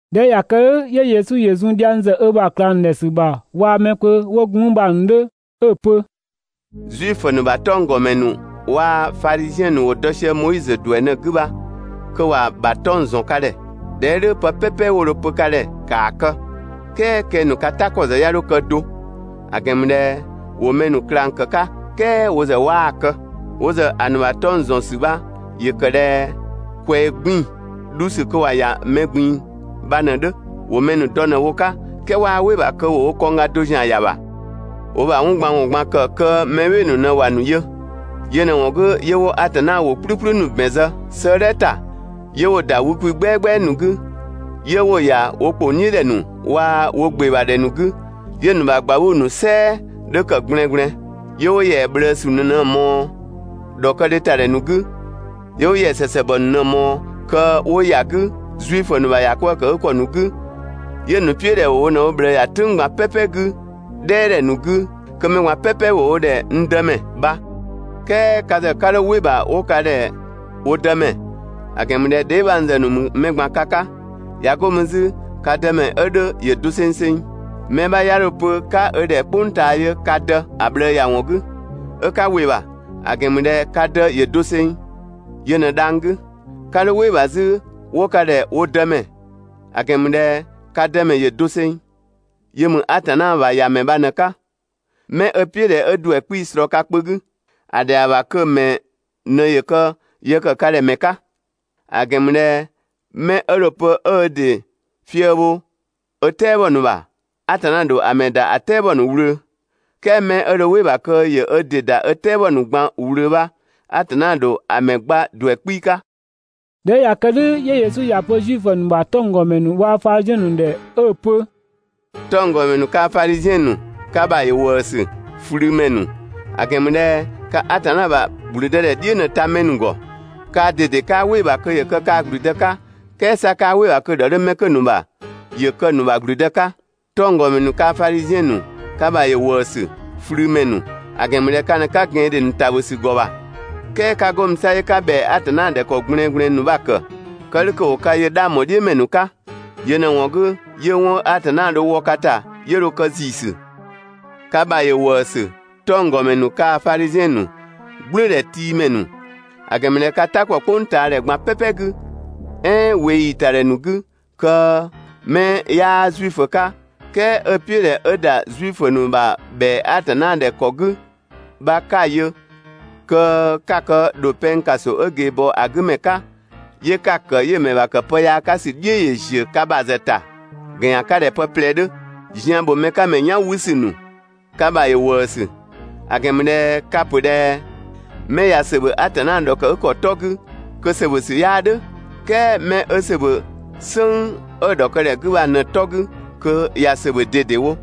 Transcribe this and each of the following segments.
꞊Dhɛ 'ö ꞊ya kë "dhʋ̈ 'yö Yesu ‑yö zun dhiang ‑zë ö ‑bha ꞊klang ‑nu ‑dhɛ ‑sü ‑bha waa‑ mɛ kpö 'wo gun mü bha‑ ‑nu 'dhö 'ö‑ pö: «Zuifö ‑nu ‑bha 'tɔnggɔmɛ ‑nu waa‑ Fadhiziɛn ‑nu ‑wo dɔ sië Moizö ‑duɛ ꞊në‑ 'gü bha kö ‑wa ‑bha 'tɔng‑ ‑zɔn ka ‑dhɛ. ꞊Dhɛ 'ö "dhʋ̈ pë "pɛpɛ 'wo dho‑ pö ka ‑dhɛ ‑kaa kë! "Kɛɛ kɛng‑ ‑nu ka "ta ‑kɔ ‑zë 'ya 'dho kë do, ‑a ‑gɛn ‑mü ꞊dhɛ ‑wo mɛ ‑nu ꞊klang ‑kë 'ka "kɛɛ wo ‑zë 'waa‑ kë. Wo ‑zë ‑a ‑nu ‑bha 'tɔng‑ ‑zɔn ‑sü bha ‑yö ‑kë ꞊dhɛ ꞊kwɛɛ 'gbiin‑ dhu ‑sü kö ‑wa ‑ya mɛ ꞊gbin‑ bha ꞊në‑ 'dhö. ‑Wo mɛ ‑nu dɔ ꞊në‑ bho‑ 'ka, "kɛɛ 'waa "wɩ‑ ‑bha kö wo ‑zë ‑wo wo kɔngga do ‑zian ‑ya ‑bha. ‑Wo wo ‑bha 'wɔn ꞊gban ‑wɔn ꞊gban ‑kë kö mɛ "bhɩɩ‑ ‑nu ꞊në ‑wa ‑nu yö. Yö ꞊në‑ ‑wɔn 'gü 'yö 'wo Atanna ‑wʋ "kplükplü ‑nu ‑bɛn zë 'sëëdhɛ ‑ta, 'yö 'wo‑ ‑da wü kwi "gbɛagbɛa ‑nu 'gü, 'yö 'wo‑ ‑ya wo ‑kpong "dhiʋ̈ ‑dhɛ ‑nu waa‑ wo ‑gbe ‑bha ‑dhɛ ‑nu 'gü, 'yö‑ ‑nu ‑bha ꞊gbauu‑ ‑nu "sɛɛ 'dhö ‑kë ꞊gblɛɛngblɛɛn. 'Yö 'wo ‑yɛa ꞊bhlëësü ‑nu ꞊në‑ ꞊mɔɔ ‑dhɔkëdhe ‑ta ‑dhɛ ‑nu 'gü, 'yö 'wo ‑yɛa ‑sɛsɛngbɔ ‑nu ꞊në‑ ꞊mɔɔ kö 'wo ‑ya 'gü Zuifö ‑nu ‑bha ‑yakwëëkëgükɔ ‑nu 'gü, 'yö‑ ‑nu "piʋ̈ ꞊dhɛ ‑wo wo ꞊në wo ꞊bhlëë ‑ya "tʋ̈ng ꞊gban "pɛpɛ 'gü "dhɛɛdhɛ ‑nu 'gü kö mɛ ꞊gban "pɛpɛ ‑wo wo ‑dhɛ ‹n Dëmɛ› bha, "kɛɛ ka ‑zë 'ka 'dho "wɩ‑ ‑bha 'wo ka ‑dhɛ wo Dëmɛ, ‑a ‑gɛn ‑mü ꞊dhɛ dheebhangzë ‑nu ‑mü mɛ ꞊gban ka 'ka. ꞊Ya 'go mü 'zü ka Dëmɛ 'ö 'dhö ‑yö dosengseng. Mɛ 'bha 'ya dho‑ pö 'ka ö ‑dhɛ "kpʋng ꞊taa yö ka dë ‑a ꞊bhlëë ‑ya ‑wɔn 'gü 'ö 'ka ‑wɩ ‑bha, ‑a ‑gɛn ‑mü ꞊dhɛ ka Dë ‑yö doseng, yö ꞊në dhang‑ 'gü. 'Ka 'dho "wɩ‑ ‑bha 'zü 'wo ka ‑dhɛ wo dëmɛ, ‑a ‑gɛn ‑mü ꞊dhɛ ka Dëmɛ ‑yö doseng, yö ‑mü Atanna ‑bha ‑Yamɛ bha ꞊në‑ 'ka. 'Mɛ 'ö‑ "piʋ̈ ꞊dhɛ 'ö ‑duɛ 'kpii‑ ꞊slɔɔ ka kpö 'gü, ‑a ‑dhɛa ‑bha kö‑ ‑mɛ ꞊në ‑yö kë yë ‑kë ka ‑dhɛ ‑mɛ 'ka. ‑A ‑gɛn ‑mü ꞊dhɛ 'mɛ 'ö dho‑ pö 'ö ö ‑dɩ fië‑ bho ö "tɛabɔ ‑nu ‑bha, Atanna ‑dho ‑a ‑mɛ ‑da ‑a "tɛabɔ ‑nu ꞊wlöö. "Kɛɛ 'mɛ 'ö dho "wɩ‑ ‑bha kö ‑yö ö ‑dɩ ‑da ö "tɛabɔ ‑nu ꞊gban ꞊wlöö bha, Atanna ‑dho ‑a ‑mɛ gba ‑duɛ 'kpii‑ 'ka. ꞊Dhɛ 'ö ꞊ya kë "dhʋ̈ 'yö Yesu ‑ya pö Zuifö ‑nu ‑bha 'tɔnggɔmɛ ‑nu waa‑ Fadhiziɛn ‑nu ‑dhɛ 'ö‑ pö: «'Tɔnggɔmɛ ‑nu kaa‑ Fadhiziɛn ‑nu, ka ‑bha ‑yö ‑wëësü, ꞊flümɛ ‑nu! ‑A ‑gɛn ‑mü ꞊dhɛ ka Atanna ‑bha ‑gblüdëdhɛ "dhiʋ̈ ꞊në‑ ta mɛ ‑nu ‑gɔ. Kaa ꞊dede 'kaa "wɩ‑ ‑bha kö ‑yö kë kaa‑ ‑gblüdë 'ka, "kɛɛ 'sa 'kaa "wɩ‑ ‑bha kö‑ ‑dhɔ 'dhö 'mɛ 'kö‑ ‑nu ‑bha ‑yö kë‑ ‑nu ‑bha ‑gblüdë 'ka. ['Tɔnggɔmɛ ‑nu kaa‑ Fadhiziɛn ‑nu, ka ‑bha ‑yö ‑wëësü, ꞊flümɛ ‑nu, ‑a ‑gɛn ‑mü ꞊dhɛ ka ꞊në 'ka ꞊gɛandhe ‑nu ‑tabhö ‑sü ‑gɔ ‑bha, "kɛɛ 'ka 'go mü 'sa 'yö 'ka ‑bhɛa Atanna ‑dhɛ ‑kɔ 'gü ꞊gblɛɛngblɛɛn ‑nu bha‑ ‑kë, kë "dhʋ̈ kö ‑wo ka yö 'dhang ‑bho "dhiʋ̈ ‑mɛ ‑nu 'ka. Yö ꞊në‑ ‑wɔn 'gü, 'yö 'wɔn 'ö Atanna dho‑ wɔ ka ‑ta 'yö dho kë ‑ziisü.] Ka ‑bha ‑yö ‑wëësü, 'tɔnggɔmɛ ‑nu kaa‑ Fadhiziɛn ‑nu, "gblʋ̈ʋ̈dhɛtiimɛ ‑nu, ‑a ‑gɛn ‑mü ꞊dhɛ ka "ta ‑kpɔ "kpʋngtaadhɛ ꞊gban "pɛpɛ 'gü, "ɛɛn ꞊weeyi ‑ta ‑dhɛ ‑nu 'gü kö 'mɛ 'yaa Zuifö 'ka, "kɛɛ 'ö‑ "piʋ̈ ꞊dhɛ 'ö ‑da Zuifö ‑nu ‑bha ‑bhɛa Atanna ‑dhɛ ‑kɔ 'gü bha 'ka‑ yö, kö 'ka‑ kë ‑dho pɛng ‑kaso 'ö ꞊geebɔɔ ‑a 'gü ‑mɛ 'ka, 'yö 'ka‑ ‑kë 'yö‑ ‑mɛ ‑bha ‑kë pë yaa 'ka ‑sü "dhiʋ̈ ‑yö ‑ziö ka ‑bha ‑zë ‑ta ‑gɛn ‑yan 'ka ꞊dhɛ pë ꞊plɛ 'dhö. Zian ‑bho mɛ 'ka ‑mɛ "yan 'wü ‑sü ‑nu, ka ‑bha ‑yö ‑wëësü! ‑A ‑gɛn ‑mü ꞊dhɛ ka‑ ‑pö ꞊dhɛ: Mɛ ꞊ya ‑sö ‑bhö Atanna ‑dhɔkëgükɔ 'tɔ 'gü kö ‑sö ‑bhö ‑sü 'yaa "dhʋ̈, "kɛɛ 'mɛ 'ö ‑sö ‑bhö "sënng 'ö‑ ‑dhɔkëgükɔ 'gü bha ꞊në‑ 'tɔ 'gü kö ꞊ya ‑sö ‑bhö ꞊dedewo.»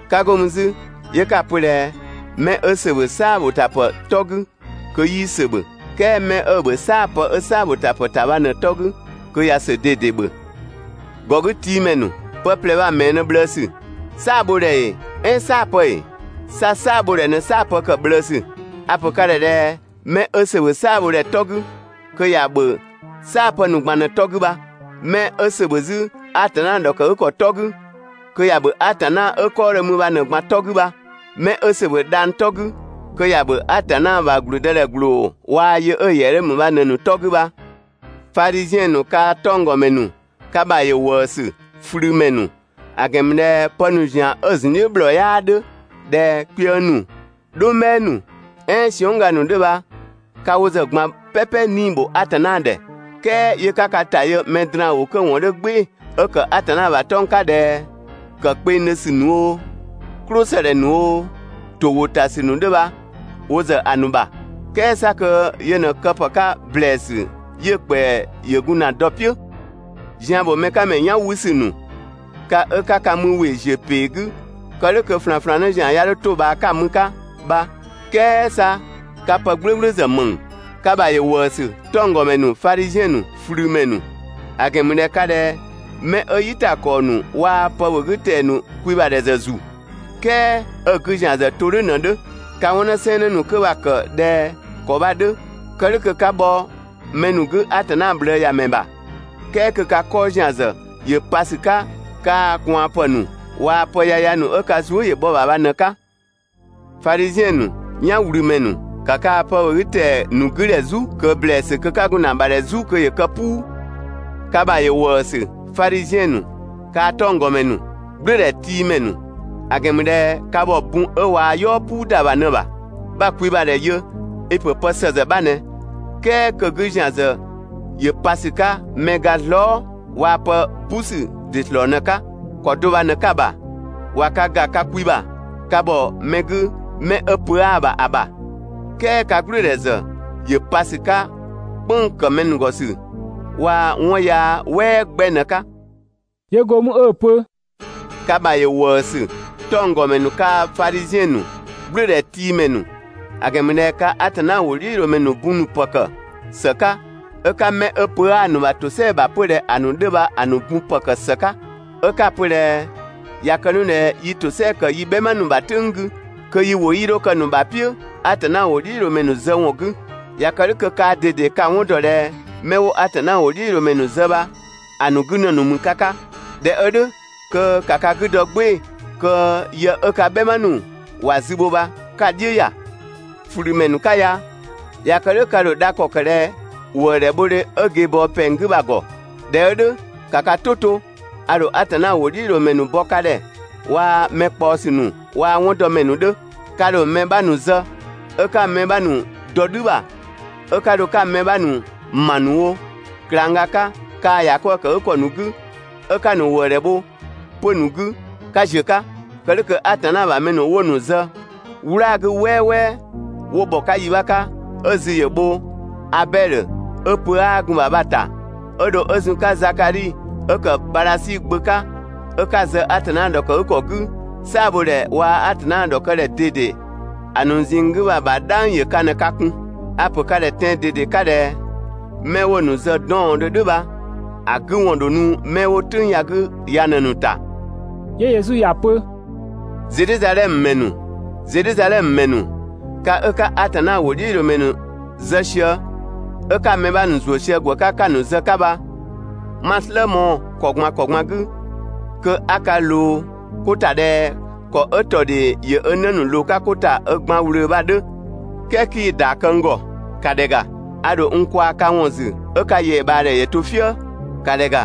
'Ka 'go mü 'zü, 'yö 'ka‑ pö ꞊dhɛ: 'Mɛ 'ö ‑sö ‑bhö "saa‑ ‑bho ‑ta ‑pë 'tɔ 'gü kö 'yii ‑sö ‑bhö. "Kɛɛ 'mɛ 'ö‑ ‑bhö "saapë 'ö "saabhotapë ‑ta bha ꞊në‑ 'tɔ 'gü kö ꞊ya ‑sö ꞊dede ‑bhö. ‑Gɔgütiimɛ ‑nu! Pë ꞊plɛ bha‑ ‑mɛɛ ꞊në ꞊bhlëësü? "Saabhodhɛ ‑ee ɛɛn "saapë ‑ee? 'Sa "saabhodhɛ ꞊në "saapë ‑kë ꞊bhlëësü. A‑ ‑pö ka ‑dhɛ ꞊dhɛ mɛ 'ö ‑sö ‑bhö "saabhodhɛ 'tɔ 'gü kö ‑ya ‑bhö "saapë ‑nu ꞊gban ꞊në‑ 'tɔ 'gü bha. 'Mɛ 'ö ‑sö ‑bhö 'zü Atanna ‑dhɔkëgükɔ 'tɔ 'gü, kö ‑ya ‑bhö Atanna 'ö‑ 'kɔɔdhö ‑mü bha ꞊në‑ ꞊gban 'tɔ 'gü bha. 'Mɛ 'ö ‑sö ‑bhö dhang‑ 'tɔ 'gü kö ‑ya ‑bhö Atanna ‑bha ‑gblüdëdhɛ ‑gblooa‑ yö 'ö‑ ‑yɛa 'dhö ‑mü bha ꞊në‑ ‑nu 'tɔ 'gü bha. Fadhiziɛn ‑nu kaa‑ 'tɔnggɔmɛ ‑nu, ka ‑bha ‑yö ‑wëësü, ꞊flümɛ ‑nu! ‑A ‑gɛn ‑mü ꞊dhɛ pë ‑nu ‑zian 'ö‑ ‑zun "dhiʋ̈ ‑bhlɔɔ 'yaa 'dhö ꞊dhɛ kpiëng ‑nu, "dhʋngbhɛɛ ‑nu, "ɛɛn siɔnng" ga ‑nu 'dhö bha ka wo ‑zë ꞊gban "pɛpɛ 'nii‑ ‑bho Atanna ‑dhɛ, "kɛɛ 'yö 'ka ka ‑ta yö mɛ draan‑ ‑wʋ 'kö‑ ‑wɔn 'dhö "gbɩɩ‑, 'ö ‑kë Atanna ‑bha 'tɔng‑ 'ka ꞊dhɛ, ‑kë kpengdhö ‑sü ‑nu oo, "klʋsëdhɛ ‑nu oo, ‑to ‑wʋ ‑ta ‑sü ‑nu 'dhö bha wo ‑zë ‑a ‑nu ‑bha, "kɛɛ 'sa kö yö ꞊në kë ‑pë 'ka ‑blɛɛsü 'yö‑ ‑kpɛa ‑yö gun ‑na dɔ‑ "piʋ̈. Zian ‑bho mɛ 'ka ‑mɛ "yan 'wü ‑sü ‑nu! Ka 'ö 'ka ka mü ‑we ‑ziö ‑pee 'gü kë "dhʋ̈ kö ꞊flanflannë ‑zian 'ya 'dho 'to‑ ꞊bhaa 'ö 'ka‑ mü‑ 'ka bha, "kɛɛ 'sa ka pë "gblʋ̈gblʋ̈ ‑zë ‑mëng! Ka ‑bha ‑yö ‑wëësü, 'tɔnggɔmɛ ‑nu, Fadhiziɛn ‑nu, ꞊flümɛ ‑nu! ‑A ‑gɛn ‑mü ꞊dhɛ ka ꞊dhɛ 'mɛ 'ö "yitakɔɔ ‑nu waa‑ pë ‑bhö 'gü ‑tɛa ‑nu kwi ‑bha ‑dhɛ ‑zë ‑zu, "kɛɛ 'ö‑ 'gü ‑zian ‑zë to "dhʋ̈ ꞊në‑ 'dhö. (Ka 'wɔn 'në sɛɛnnë ‑nu 'kö bha‑ ‑kë ꞊dhɛ ‑kɔ bha‑ 'dhö kë "dhʋ̈ kö 'ka bhɔ mɛ ‑nu 'gü Atanna ꞊bhlëëyamɛ ‑nu ‑bha "kɛɛ kö) ka 'kɔɔ ‑zian ‑zë ‑yö pa ‑sü 'ka kaa‑ ꞊kwaanpë ‑nu waa‑ pë yaya ‑nu 'ö ka zuë" ‑yö bhɔ‑ ‑bha bha ꞊në‑ 'ka. Fadhiziɛn ‑nu, "yanwlümɛ ‑nu! ‑Ka kaa‑ pë ‑bhö 'gü ‑tɛa ‑nu 'gü ‑dhɛ "zu ꞊kö ‑blɛɛsü kö 'ka gun ‑na ‑bha ‑dhɛ "zu kö ‑yö kë "puu! Ka ‑bha ‑yö ‑wëësü, Fadhiziɛn ‑nu kaa‑ 'tɔnggɔmɛ ‑nu, "gblʋ̈ʋ̈dhɛtiimɛ ‑nu! ‑A ‑gɛn ‑mü ꞊dhɛ ka ‑bhɔ bun ö ꞊wa "yɔɔ "puu ‑da ‑bha ꞊në‑ ‑bha. 'Bha‑ kwi ‑bha ‑dhɛ yö i‑ pö pë ‑së ‑zë 'bha ꞊nɛ, "kɛɛ kö‑ 'gü ‑zian ‑zë ‑yö pa ‑sü 'ka mɛ ga zlɔɔ" waa‑ pë "busü ‑dɩ ‑slɔɔ ꞊në‑ 'ka. ‑Kɔ do bha ꞊në 'ka‑ ‑bha, ꞊wa ka ‑ga ka kwi ‑bha ka ‑bhɔ mɛ ‑nu 'gü 'mɛ 'ö pö 'aa‑ ‑bha ‑a ‑bha, "kɛɛ ka "gblʋ̈ʋ̈dhɛ ‑zë ‑yö pa ‑sü 'ka "kpënng‑ ‑kë mɛ ‑nu ‑gɔ ‑sü waa‑ 'wɔn yaa "wɛɛ 'gbɛ ꞊në‑ 'ka.» 'Yö go mü 'ö‑ pö: «Ka ‑bha ‑yö ‑wëësü, 'tɔnggɔmɛ ‑nu kaa‑ Fadhiziɛn ‑nu, "gblʋ̈ʋ̈dhɛtiimɛ ‑nu! ‑A ‑gɛn ‑mü ꞊dhɛ ka Atanna ‑wʋdhiʋ̈loomɛ ‑nu bun ‑nu ‑pë ‑kë ‑së 'ka, 'ö 'ka 'mɛ 'ö pö 'aa‑ ‑nu ‑bha ‑tosɛa ‑bha 'pö ꞊dhɛ ‑a ‑nu 'dhö bha‑ ‑nu bun ‑pë ‑kë ‑së 'ka. 'Ö 'ka‑ pö ꞊dhɛ: ‹꞊Ya kë 'nu ꞊dhɛ yi ‑tosɛa ‑kë yi "bhɛma ‑nu ‑bha "tʋ̈ng 'gü kö yi ‑wʋ 'yii 'dho kë‑ ‑nu ‑bha "piʋ̈ Atanna ‑wʋdhiʋ̈loomɛ ‑nu zë ‑wɔn 'gü.› ꞊Ya kë "dhʋ̈ kö kaa ꞊dede ka‑ 'wɔn ‑dɔ ꞊dhɛ 'mɛ 'wo Atanna ‑wʋdhiʋ̈loomɛ ‑nu zë bha‑ ‑nu 'gü ‑në ‑nu ‑mü ka 'ka. ꞊Dhɛ 'ö "dhʋ̈ kö ‑ka ka 'gü dɔ "gbɩɩ‑ kö yë 'ö ka "bhɛma ‑nu ‑wa zü bho bha 'ka‑ "dhiʋ̈ ‑ya! ꞊Flümɛ ‑nu 'ka ya! ꞊Ya kë "dhʋ̈ ka ‑dho dha ‑kɔ kë ꞊dhɛ ‑wëëdhɛ bhodhe 'ö ꞊geebɔɔ pɛng 'gü bha‑ ‑gɔ? ꞊Dhɛ 'ö "dhʋ̈ ‑ka ka "tʋ to, a ‑dho Atanna ‑wʋdhiʋ̈loomɛ ‑nu bɔ ka ‑dhɛ waa‑ mɛ ꞊kpaɔsü ‑nu waa‑ 'wɔndɔmɛ ‑nu 'dhö. Ka ‑dho mɛ 'bha ‑nu zë 'ö 'ka‑ mɛ 'bha ‑nu dɔ "dhü ‑bha 'ö 'ka dho 'ka‑ mɛ 'bha ‑nu ‑ma ‑nu wo ꞊klangga 'ka kaa‑ ‑yakwëëkëgükɔ ‑nu 'gü 'ö 'ka‑ ‑nu ‑wëëdhɛ bho 'pö‑ ‑nu 'gü 'ka ‑ziö 'ka. Kë "dhʋ̈ kö Atanna ‑bha mɛ ‑nu 'wo‑ ‑nu zë "wlaa‑ 'gü "wɛɛwɛɛ 'wo ‑bhɔ 'ka yi 'bha 'ka 'ö‑ zü ‑yö bho Abɛdhö 'ö pö 'aa gun‑ ‑bha bha‑ ‑ta 'ö dho 'ö zun‑ 'ka Zakadhi 'ö ‑kë Badhasi gbö 'ka 'ö 'ka‑ zë Atanna ‑dhɔkëgükɔ 'gü, "saabhodhɛ waa‑ Atanna ‑dhɔkëdhɛ ꞊dede ‑a ‑nu ꞊zinng 'gü bha‑ ‑bha bha‑ "dhang ‑yö ka ꞊në ka 'kun. A‑ ‑pö ka ‑dhɛ tɛan‑ ꞊dede 'ka ꞊dhɛ: 'Mɛ 'wo‑ ‑nu zë 'dɔɔndhö "dhʋ̈ bha‑ 'gü ‑wɔn ‑dho nu 'mɛ 'wo "tʋ̈ng ya‑ 'gü ya ꞊në‑ ‑nu ‑ta.» 'Yö Yesu ‑ya pö: «Zedhizadhɛmö ‑mɛ ‑nu, Zedhizadhɛmö ‑mɛ ‑nu, ka 'ö 'ka Atanna ‑wʋdhiʋ̈loomɛ ‑nu zë sië 'ö 'ka‑ mɛ 'bha ‑nu ‑zuö sië ‑gwë 'ka 'ka‑ ‑nu zë‑ 'ka bha, 'ma‑ "slë mɔɔ‑ ‑kɔ ꞊gban ‑kɔ ꞊gban 'gü kö 'a ka ꞊loo 'ko ‑ta ꞊dhɛ ‑kɔ 'ö ‑tɔ ‑dhee ‑yö ö 'në ‑nu ꞊loo‑ 'ka ö gban ꞊wlöö bha‑ 'dhö, "kɛɛ 'kii‑ ‑yɔ bɔ n ‑gɔ! ‑Ka ‑dhɛ ‑ga, a ‑dho n kwaa‑ ka ‑wɔn ‑zü 'ö ka ‑yɛabhaadhɛ ‑yö to "fië. ‑Ka ‑dhɛ ‑ga!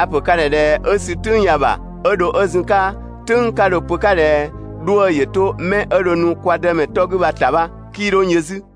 A‑ pö ka ‑dhɛ ꞊dhɛ 'ö sü "tʋ̈ng ya‑ ‑bha 'ö dho 'ö zun‑ 'ka "tʋ̈ng 'ka dho‑ pö‑ 'ka ꞊dhɛ 'dhuë‑ ‑yö 'to 'mɛ 'ö dho nu kwa Dëmɛ 'tɔ 'gü bha‑ ‑ta bha‑ ‑bha, 'kii 'dho n yö 'zü.